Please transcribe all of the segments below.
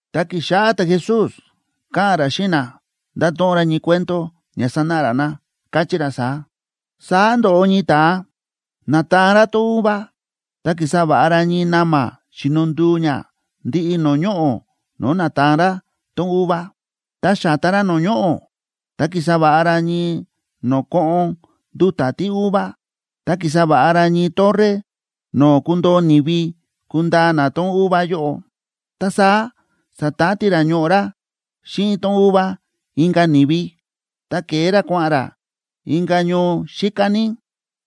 Ta ki̱xáꞌá ta̱Jesús káꞌa̱n ra xíꞌin na, nda̱to̱ꞌon ra ñii cuento ña sanáꞌa ra na, káchí ra saá: ―Saá ndo̱ꞌo ñii ta̱a, na̱taan ra tón uva. Ta ki̱sa va̱ꞌa ra ñii na̱ma̱ xíno nduu ña ndiꞌi no̱o̱ ñoꞌo̱ no̱o̱ na̱taan ra tón uva. Ta xa̱ta ra no̱o̱ ñoꞌo̱ ta ki̱sa va̱ꞌa ra ñii no̱o̱ koꞌon nduta̱ tíuva, ta ki̱sa va̱ꞌa ra ñii torre no̱o̱ kundoo ni̱vi kundaa na tón uva yóꞌo. Ta saá sa̱tati ra ñoꞌo̱ ra xíꞌin tón uva inka̱ ni̱vi, ta ke̱e ra kua̱ꞌa̱n ra inka̱ ñoo xíká ní.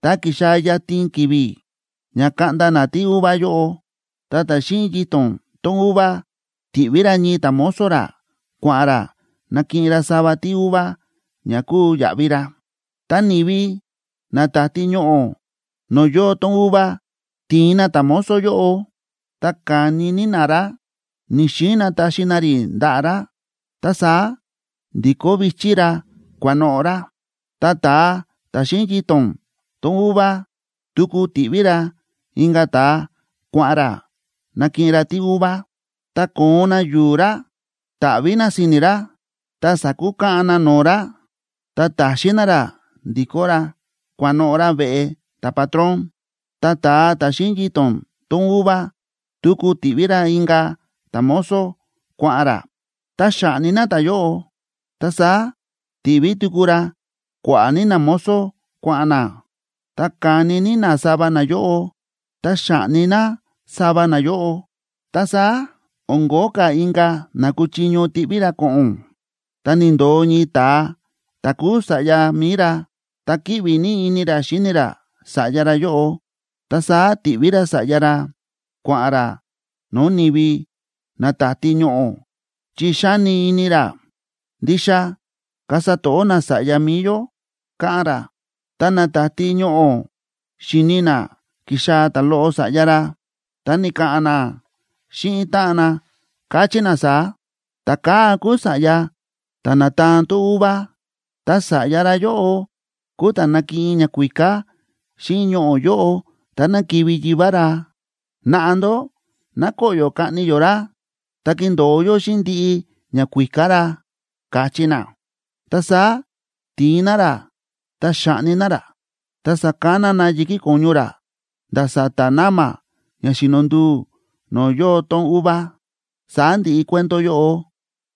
Ta ki̱xaa̱ yatin ki̱vi̱ ña kaꞌnda na tíuva yóꞌo, ta ta̱ xíꞌin yito̱n tón uva ti̱ꞌví ra ñii ta̱mozo ra kua̱ꞌa̱n ra nakiꞌin ra sava tíuva ña kuu yaꞌvi ra. Ta ni̱vi na táti ñoꞌo̱ no̱o̱ yóo tón uva ti̱in na ta̱mozo yóꞌo, ta ka̱ni ní na ra, ni̱‑xiin na taxi na rí ndaꞌa̱ ra, ta saá ndi̱kó vi̱chí ra kua̱noꞌo̱ ra. Ta ta̱a ta̱ xíꞌin yito̱n tón uva tuku ti̱ꞌví ra inka̱ ta̱a kua̱ꞌa̱n ra nakiꞌin ra tíuva. Ta ko̱on na yu̱u̱ ra, ta̱ꞌví na si̱ni̱ ra, ta sa̱kukaꞌan na no̱o̱ ra, ta ta̱xin na ra ndikó ra kua̱noꞌo̱ ra veꞌe ta̱patrón. Ta ta̱a ta̱ xíꞌin yito̱n tón uva tuku ti̱ꞌví ra inka̱ ta̱mozo kua̱ꞌa̱n ra, ta xa̱ꞌni na ta̱yóꞌo. Ta saá ti̱ꞌví tuku ra kua̱ꞌa̱ ní namozo kua̱ꞌa̱n na, ta ka̱ni ní na sava nayóꞌo, ta xa̱ꞌni na sava nayóꞌo. ’Ta saá o̱n ko̱ó ka̱ inka̱ na kúchiño tiꞌví ra ko̱ꞌo̱n, ta ni̱ndo̱o ñii ta̱a ta̱ kúu sa̱ꞌya mi̱i ra, ta kíꞌvi ní ini ra xíni ra sa̱ꞌya ra yóꞌo. Ta saá ti̱ꞌví ra sa̱ꞌya ra kua̱ꞌa̱n ra no̱o̱ ni̱vi na táti ñoꞌo̱, chi xa̱ni ini ra: “Ndixa kasa to̱ꞌó na sa̱ꞌya mi̱i yó”, káꞌán ra. Ta na táti ñoꞌo̱ xi̱ni na kíxaa̱ ta̱loꞌo sa̱ꞌya ra, ta ni̱ka̱ꞌa̱n na xíꞌin táꞌan na, káchí na saá: “Ta̱kaa̱ kúu sa̱ꞌya ta̱ na̱taan tón uva, ta sa̱ꞌya ra yóꞌo kúu ta̱ nakiꞌin ñakuíká xíꞌin ñoꞌo̱ yóꞌo táná kivi̱ yivá ra. Naꞌa ndó ná koꞌyo̱ kaꞌni yó ra, ta kindo̱o yó xíꞌin ndiꞌi ñakuíká ra”, káchí na. Ta saá ti̱in na ra, ta xa̱ꞌni na ra, ta sa̱kana na yi̱kí ko̱ñu ra nda̱ sa̱ta̱ na̱ma̱ ña xíno nduu no̱o̱ yóo tón uva. Saá ndi̱ꞌi cuento yóꞌo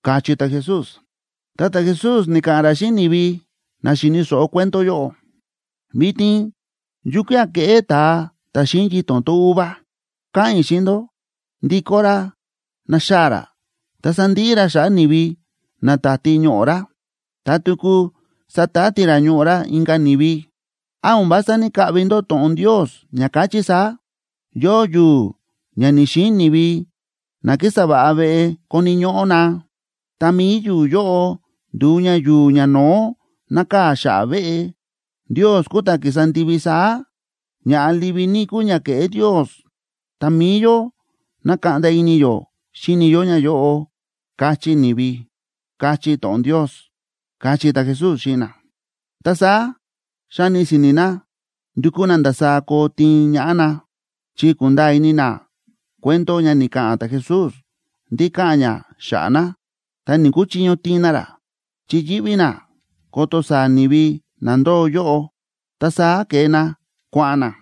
―káchí ta̱Jesús. Ta ta̱Jesús ni̱ka̱ꞌa̱n ra xíꞌin ni̱vi na xi̱ni̱ so̱ꞌo cuento yóꞌo: ―¿Vitin yukía̱ keꞌé ta̱a ta̱ xíꞌin yito̱n tón uva? Káꞌa̱n i̱ xíꞌin ndó, ndikó ra naxaa̱ ra, ta sandiꞌi ra xa̱ꞌa̱ ni̱vi na táti ñoꞌo̱ ra. Ta tuku satati ra ñoꞌo̱ ra inka̱ ni̱vi. ’¿Án o̱n vása ní‑kaꞌvi ndó to̱ꞌon Ndios, ña káchí saá?: Yóo yu̱u̱ ña ni̱‑xiin ni̱vi na kísa va̱ꞌa veꞌe koni̱ ñóꞌó na, ta mi̱i yu̱u̱ yóꞌo ndu̱u ña yu̱u̱ ñano̱ó nákaa̱ xa̱ꞌa̱ veꞌe. Ndios kúu ta̱ ki̱sa ndivi saá, ña̱ꞌa livi ní kúu ña ke̱ꞌé Ndios, ta mi̱i yó na̱kaꞌnda ini yó xíni yó ñayóꞌo, káchí ni̱vi, káchí to̱ꞌon Ndios ―káchí ta̱Jesús xíꞌin na. Ta saá xa̱ni si̱ni̱ na ndu̱kú na ndasaá koo tiin ñaꞌá na, chi ku̱nda̱a̱ ini na cuento ña ni̱ka̱ꞌa̱n ta̱Jesús ndí káꞌa̱n ña xa̱ꞌa̱ na. Ta ni̱‑kuchiño tiin na ra, chi yíꞌví na ko̱to̱ saa̱ ni̱vi na ndóo yóꞌo. Ta saá ke̱e na kua̱ꞌa̱n na.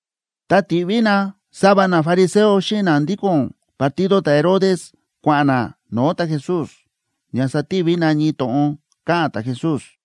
Ta ti̱ꞌví na sava nafariseo xíꞌin na ndíko̱n partido ta̱Herodes kua̱ꞌa̱n na no̱o̱ ta̱Jesús ña sativi na ñii to̱ꞌon ka̱ꞌa̱n ta̱Jesús.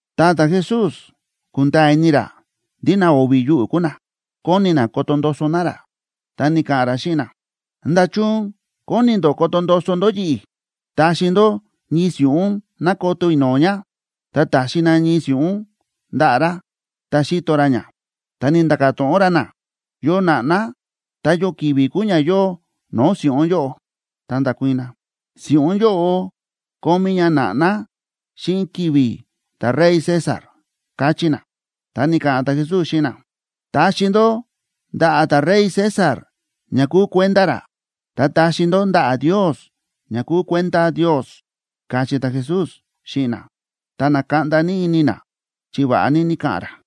Ta ta̱Jesús kúnda̱a̱ ini ra ndí na o̱vi̱ yuꞌu̱ kúu na, kóni na koto ndoso na ra, ta ni̱ka̱ꞌa̱n ra xíꞌin na: ―¿Nda̱chun kóni ndó koto ndoso ndó yi̱ꞌi̱? Taxi ndó ñii si̱ꞌún ná koto i̱ no̱o̱ ña. Ta ta̱xi na ñii si̱ꞌún ndaꞌa̱ ra, ta xíto ra ña, ta ni̱nda̱ka̱ to̱ꞌon ra na: ―¿Yo na̱ꞌná, ta yo ki̱vi̱ kúu ña yóo no̱o̱ si̱ꞌún yóꞌo? Ta nda̱kuii̱n na: ―Si̱ꞌún yóꞌo kómí ña na̱ꞌná xíꞌin ki̱vi̱ ta̱rey César ―káchí na. Ta ni̱ka̱ꞌa̱n ta̱Jesús xíꞌin na: ―Taxi ndó ndaꞌa̱ ta̱rey César ña kúu kuenda ra, ta taxi ndó ndaꞌa̱ Ndios ña kúu kuenda Ndios ―káchí ta̱Jesús xíꞌin na. Ta na̱kaꞌnda ní ini na chi va̱ꞌa ní ni̱ka̱ꞌa̱n ra.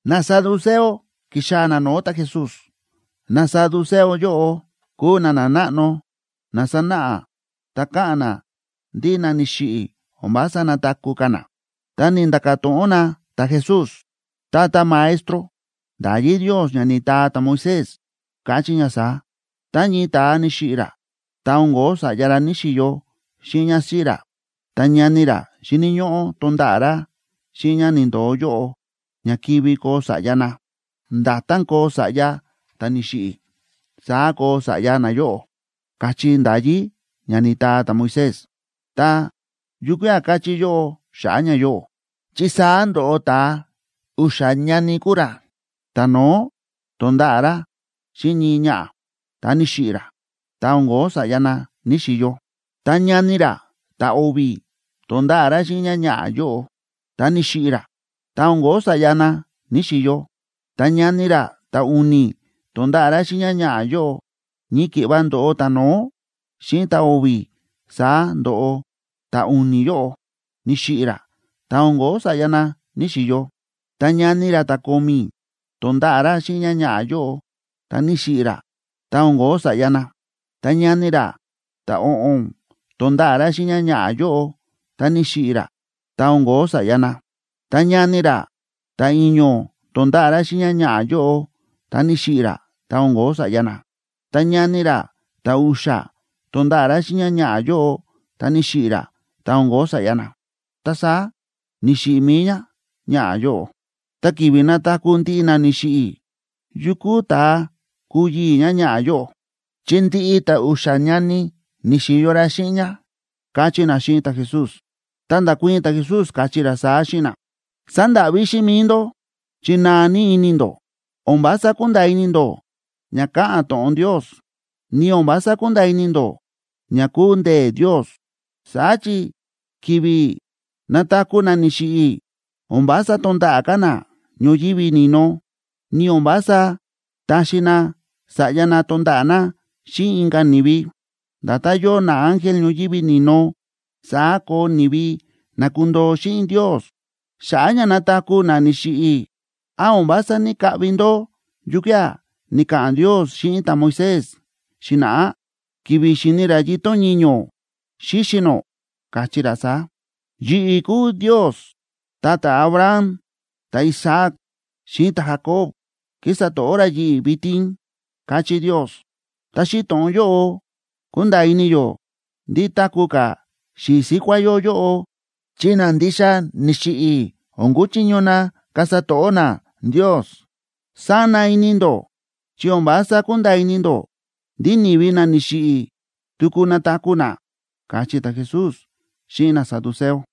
Nasaduceo ki̱xaa̱ na no̱o̱ ta̱Jesús. Nasaduceo yóꞌo kúu na nanáꞌno na sánáꞌa ta káꞌa̱n na ndí na ni̱xiꞌi̱ o̱n vása nataku̱ ka̱ na. Ta ni̱nda̱ka̱ to̱ꞌon na ta̱Jesús: ―Tata Maestro, nda̱yí Ndios ña ni̱taa ta̱Moisés, káchí ña saá: “Tá ñii ta̱a ni̱xiꞌi̱ ra, ta o̱n ko̱ó sa̱ꞌya ra ní‑xiyo xíꞌin ñásíꞌí ra, ta ñani ra xíni̱ ñóꞌó tonda̱ꞌa̱ ra xíꞌin ñá ni̱ndo̱o yóꞌo, ña kivi koo sa̱ꞌya na. Nda̱tán koo sa̱ꞌya ta̱ ni̱xiꞌi̱, saá koo sa̱ꞌya nayóꞌo”, káchí nda̱yí ña ni̱taa ta̱Moisés. Ta, ¿yukía̱ káchí yóꞌó xa̱ꞌa̱ ñayóꞌo? Chi saá ndo̱ꞌo ta̱a, u̱xa̱ ñani kúu ra. Ta̱no̱ó to̱nda̱ꞌa̱ ra xíꞌin ñii ñaꞌa̱, ta ni̱xiꞌi̱ ra, ta o̱n ko̱ó sa̱ꞌya na ní‑xiyo. Ta ñani ra ta̱o̱vi̱ to̱nda̱ꞌa̱ ra xíꞌin ñáñaꞌa̱ yóꞌo, ta ni̱xiꞌi̱ ra, ta o̱n ko̱ó sa̱ꞌya na ní‑xiyo. Ta ñani ra ta̱u̱ni̱ to̱nda̱ꞌa̱ ra xíꞌin ñáñaꞌa̱ yóꞌo. Ñii ki̱ꞌva ndo̱ꞌo ta̱no̱ó xíꞌin ta̱o̱vi̱, saá ndo̱ꞌo ta̱u̱ni̱ yóꞌo, ni̱xiꞌi̱ ra, ta o̱n ko̱ó sa̱ꞌya na ní‑xiyo. Ta ñani ra ta̱ko̱mi̱ to̱nda̱ꞌa̱ ra xíꞌin ñáñaꞌa̱ yóꞌo, ta ni̱xiꞌi̱ ra, ta o̱n ko̱ó sa̱ꞌya na. Ta ñani ra ta̱o̱ꞌo̱n to̱nda̱ꞌa̱ ra xíꞌin ñáñaꞌa̱ yóꞌo, ta ni̱xiꞌi̱ ra, ta o̱n ko̱ó sa̱ꞌya na. Ta ñani ra ta̱i̱ño̱ to̱nda̱ꞌa̱ ra xíꞌin ñáñaꞌa̱ yóꞌo, ta ni̱xiꞌi̱ ra, ta o̱n ko̱ó sa̱ꞌya na. Ta ñani ra ta̱u̱xa̱ to̱nda̱ꞌa̱ ra xíꞌin ñáñaꞌa̱ yóꞌo, ta ni̱xiꞌi̱ ra, ta o̱n ko̱ó sa̱ꞌya na. Ta saá ni̱xiꞌi̱ mi̱i ñáñaꞌa̱ yóꞌo. Ta ki̱vi̱ nataku̱ ndiꞌi na ni̱xiꞌi̱, ¿yukú ta̱a kuu yii̱ ñáñaꞌa̱ yóꞌo?, chi ndiꞌi ta̱a u̱xa̱ ñani ni̱xi̱yo ra xíꞌin ñá ―káchí na xíꞌin ta̱Jesús. Ta nda̱kuii̱n ta̱Jesús, káchí ra saá xíꞌin na: ―Sándáꞌví xíꞌin mi̱i ndó, chi naa ní ini ndó, o̱n vása kúnda̱a̱ ini ndó ña káꞌa̱n to̱ꞌon Ndios, ni o̱n vása kúnda̱a̱ ini ndó ña kúu ndee̱ Ndios. Saá chi ki̱vi̱ nataku̱ na ni̱xiꞌi̱, o̱n vása tonda̱ꞌa̱ ka̱ na ñoyívi ni̱no, ni o̱n vása taxi na sa̱ꞌya na tonda̱ꞌa̱ na xíꞌin inka̱ ni̱vi. Nda̱tán yóo naángel ñoyívi ni̱no, saá koo ni̱vi na kundoo xíꞌin Ndios. Xa̱ꞌa̱ ña nataku̱ na ni̱xiꞌi̱, ¿án o̱n vása ní‑kaꞌvi ndó yukía̱ ni̱ka̱ꞌa̱n Ndios xíꞌin ta̱Moisés xi̱na̱ꞌá, ki̱vi̱ xi̱ni ra yito̱n ñiño̱ xíxi̱ nó? Káchí ra saá: “Yi̱ꞌi̱ kúu Ndios, ta ta̱Abraham, ta̱Isaac, xíꞌin ta̱Jacob kísa to̱ꞌó ra yi̱ꞌi̱ vitin”, káchí Ndios. Ta xíꞌin to̱ꞌon yóꞌo kúnda̱a̱ ini yó ndí táku̱ ka̱ xi̱i̱ síkuá yó yóꞌo, chi na ndixa ni̱xiꞌi̱ o̱n kuchiño na kasa to̱ꞌó na Ndios. Sána ini ndó chi o̱n vása kúnda̱a̱ ini ndó ndí ni̱vi na ni̱xiꞌi̱ tuku nataku̱ na ―káchí ta̱Jesús xíꞌin nasaduceo.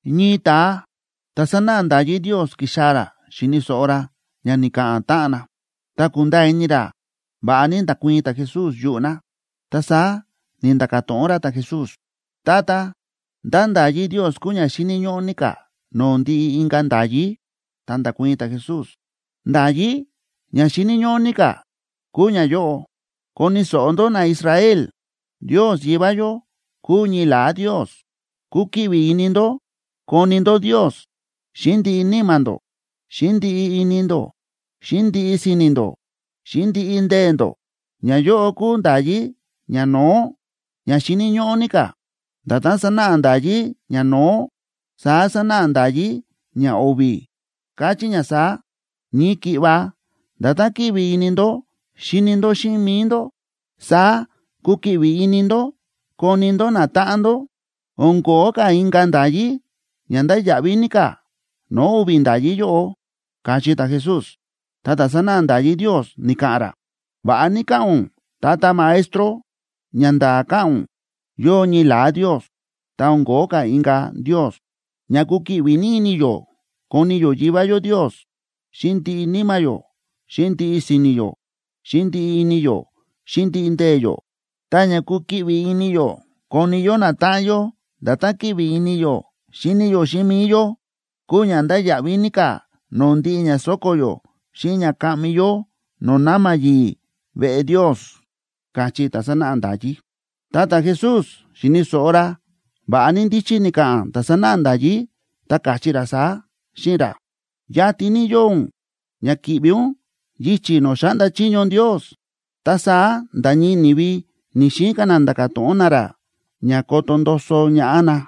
Ñii ta̱a ta̱ sánáꞌa nda̱yí Ndios ki̱xaa̱ ra xi̱ni̱ so̱ꞌo ra ña ni̱ka̱ꞌa̱n táꞌan na. Ta ku̱nda̱a̱ ini ra va̱ꞌa ní nda̱kuii̱n ta̱Jesús yuꞌu̱ na, ta saá ni̱nda̱ka̱ to̱ꞌon ra ta̱Jesús: ―Tata, ¿ndá nda̱yí Ndios kúu ña xíni̱ ñóꞌó ní ka̱ no̱o̱ ndiꞌi inka̱ nda̱yí? Ta nda̱kuii̱n ta̱Jesús: ―Nda̱yí ña xíni̱ ñóꞌó ní ka̱ kúu ñayóꞌo: “Koni̱ so̱ꞌo ndó, naIsrael, Ndios Yivá yó kúu ñii la̱á Ndios. Kukiꞌvi ini ndó koni ndó Ndios xíꞌin ndiꞌi níma̱ ndó, xíꞌin ndiꞌi ini ndó, xíꞌin ndiꞌi si̱ni̱ ndó, xíꞌin ndiꞌi ndee̱ ndó.” Ñayóꞌo kúu nda̱yí ñano̱ó, ña xíni̱ ñóꞌó ní ka̱. Nda̱tán sánáꞌa nda̱yí ñano̱ó, saá sánáꞌa nda̱yí ñao̱vi̱, káchí ña saá: “Ñii ki̱ꞌva nda̱tán kíꞌvi ini ndó xíni ndó xíꞌin mi̱i ndó, saá kukiꞌvi ini ndó koni ndó natáꞌan ndó.” O̱n ko̱ó ka̱ inka̱ nda̱yí ña ndáya̱ꞌví ní ka̱ no̱o̱ o̱vi̱ nda̱yí yóꞌo ―káchí ta̱Jesús. Ta ta̱ sánáꞌa nda̱yí Ndios ni̱ka̱ꞌa̱n ra: ―Va̱ꞌa ní káꞌa̱n ún, Tata Maestro. Ñanda̱a̱ káꞌa̱n ún yóo ñii la̱á Ndios, ta o̱n ko̱ó ka̱ inka̱ Ndios. Ña kukiꞌvi ini yó koni yó Yivá yó Ndios xíꞌin ndiꞌi níma̱ yó, xíꞌin ndiꞌi si̱ni̱ yó, xíꞌin ndiꞌi ini yó, xíꞌin ndiꞌi ndee̱ yó, ta ña kukiꞌvi ini yó koni yó natáꞌan yó nda̱tán kíꞌvi ini yó xíni yó xíꞌin mi̱i yó kúu ña ndáya̱ꞌví ní ka̱ no̱o̱ ndiꞌi ña so̱ko̱ yó xíꞌin ña kaꞌmi yó no̱o̱ na̱ma̱ yi̱i̱ veꞌe Ndios ―káchí ta̱ sánáꞌa nda̱yí. Tá ta̱Jesús xi̱ni̱ so̱ꞌo ra va̱ꞌa ní ndíchí ni̱ka̱ꞌa̱n ta̱ sánáꞌa nda̱yí, ta káchí ra saá xíꞌin ra: ―Yatin ní yóo ún ña ki̱ꞌvi ún yichi̱ no̱o̱ xáꞌnda chiño Ndios. Ta saá nda̱ ñii ni̱vi ni̱‑xiin ka̱ na nda̱ka̱ to̱ꞌon na ra ña koto ndoso ñaꞌá na.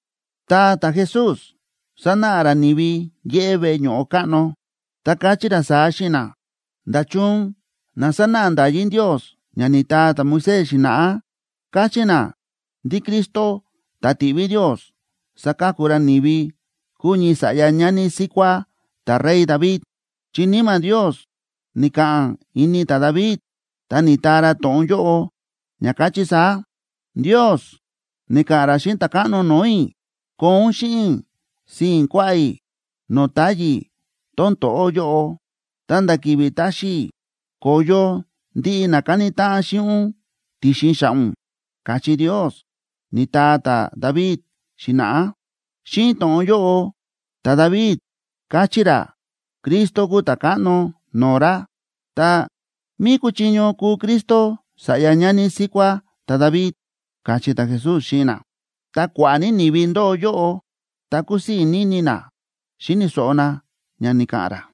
Ta ta̱Jesús sa̱náꞌa ra ni̱vi yéꞌé veꞌe ño̱ꞌo káꞌno, ta káchí ra saá xíꞌin na: ―¿Nda̱chun na sánáꞌa nda̱yí Ndios ña ni̱taa ta̱Moisés xi̱na̱ꞌá káchí na ndí Cristo, ta̱ tiꞌví Ndios saka̱ku ra ni̱vi, kuu ñii sa̱ꞌya ñani síkuá ta̱rey David? Chi Níma̱ Ndios ni̱ka̱ꞌa̱n ini ta̱David, ta ni̱taa ra to̱ꞌon yóꞌo, ña káchí saá: Ndios ni̱ka̱ꞌa̱n ra xíꞌin Ta̱káꞌno no̱o̱ i̱: “Koo ún xíꞌin i̱ sii̱n kuaꞌá i̱ no̱o̱ táyi̱ tón to̱ꞌó yóꞌo, ta̱nda̱ ki̱vi̱ taxi i̱ ko̱yo ndiꞌi na káni táꞌan xíꞌin ún ti̱xin xa̱ꞌa̱ ún”, káchí Ndios, ni̱taa ta̱David xi̱na̱ꞌá. Xíꞌin to̱ꞌon yóꞌo ta̱David káchí ra Cristo kúu Ta̱káꞌno no̱o̱ ra. Ta, ¿mí kúchiño kúu Cristo sa̱ꞌya ñani síkuá ta̱David? ―káchí ta̱Jesús xíꞌin na. Ta kua̱ꞌa̱ ní ni̱vi ndóo yóꞌo, ta kúsii̱ ní ini na xíni̱ so̱ꞌo na ña ni̱ka̱ꞌa̱n ra.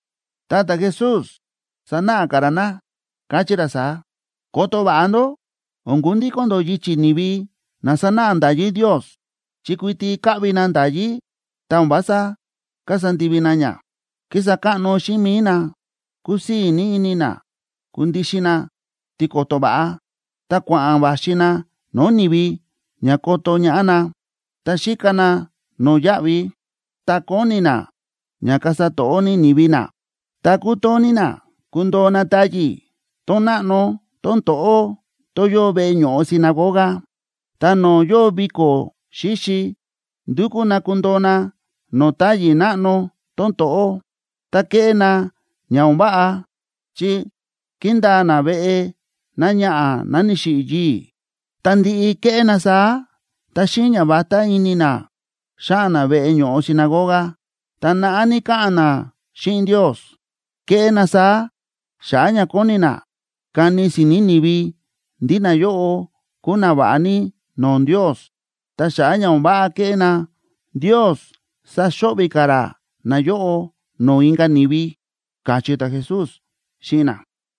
Ta ta̱Jesús sa̱náꞌa ka̱ ra na, káchí ra saá: ―Koto va̱ꞌa ndó o̱n kundíko̱n ndó yichi̱ ni̱vi na sánáꞌa nda̱yí Ndios, chi kuiti káꞌvi na nda̱yí ta o̱n vása kasa ndivi na ña. Kísa káꞌno xíꞌin mi̱i na, kúsii̱ ní ini na kundixin na tiko̱to̱ va̱ꞌa, ta kua̱ꞌa̱n va̱xi na no̱o̱ ni̱vi ña koto ñaꞌá na. Ta xíka na no̱yáꞌvi, ta kóni na ña kasa to̱ꞌó ní ni̱vi na, ta kútoo ní na kundoo na táyi̱ tón náꞌno tón to̱ꞌó tón yóo veꞌe ño̱ꞌo sinagoga. Ta no̱o̱ yóo viko̱ xíxi, ndúkú na kundoo na no̱o̱ táyi̱ náꞌno tón to̱ꞌó. Ta kéꞌé na ña o̱n váꞌa, chi kíndaa na veꞌe náñaꞌa̱ ná ni̱xiꞌi̱ yii̱. Ta ndi̱ꞌi ke̱ꞌé na saá ta xíꞌin ñavatá ini na, xáꞌa̱n na veꞌe ño̱ꞌo sinagoga, ta naꞌá ní káꞌa̱n na xíꞌin Ndios. Kéꞌé na saá xa̱ꞌa̱ ña kóni na kani si̱ni̱ ni̱vi ndí nayóꞌo kúu nava̱ꞌa ní no̱o̱ Ndios. Ta xa̱ꞌa̱ ña o̱n váꞌa kéꞌé na, Ndios saxo̱ꞌvi̱ ka̱ ra nayóꞌo no̱o̱ inka̱ ni̱vi ―káchí ta̱Jesús xíꞌin na.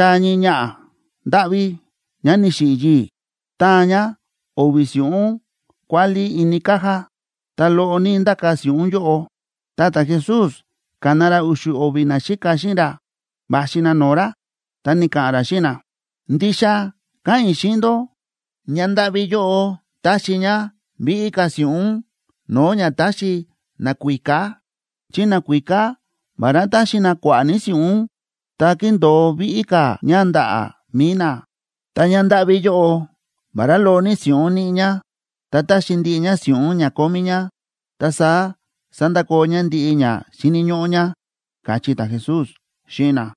Ta ki̱xaa̱ ñii ñaꞌa̱ ndáꞌví ñá ni̱xiꞌi̱ yii̱, táan ñá o̱vi̱ si̱ꞌún kuálí ini caja, ta loꞌo ní ndáka̱ si̱ꞌún yóꞌo. Ta ta̱Jesús ka̱na ra u̱xu̱ o̱vi̱ naxíka xíꞌin ra va̱xi na no̱o̱ ra, ta ni̱ka̱ꞌa̱n ra xíꞌin na: ―Ndixa káꞌa̱n i̱ xíꞌin ndó, ñándáꞌví yóꞌo ta̱xi ñá víꞌí ka̱ si̱ꞌún no̱o̱ ña ta̱xi nakuíká, chi nakuíká, vará ta̱xi na kua̱ꞌa̱ ní si̱ꞌún, ta ki̱ndo̱o víꞌí ka̱ ña ndaꞌa̱ mi̱i na. Ta ñándáꞌví yóꞌo, vará loꞌo ní si̱ꞌún níꞌi ñá, ta ta̱xi ndiꞌi ñá si̱ꞌún ña kómí ñá, ta saá sa̱ndakoo ñá ndiꞌi ña xíni̱ ñóꞌó ñá ―káchí ta̱Jesús xíꞌin na.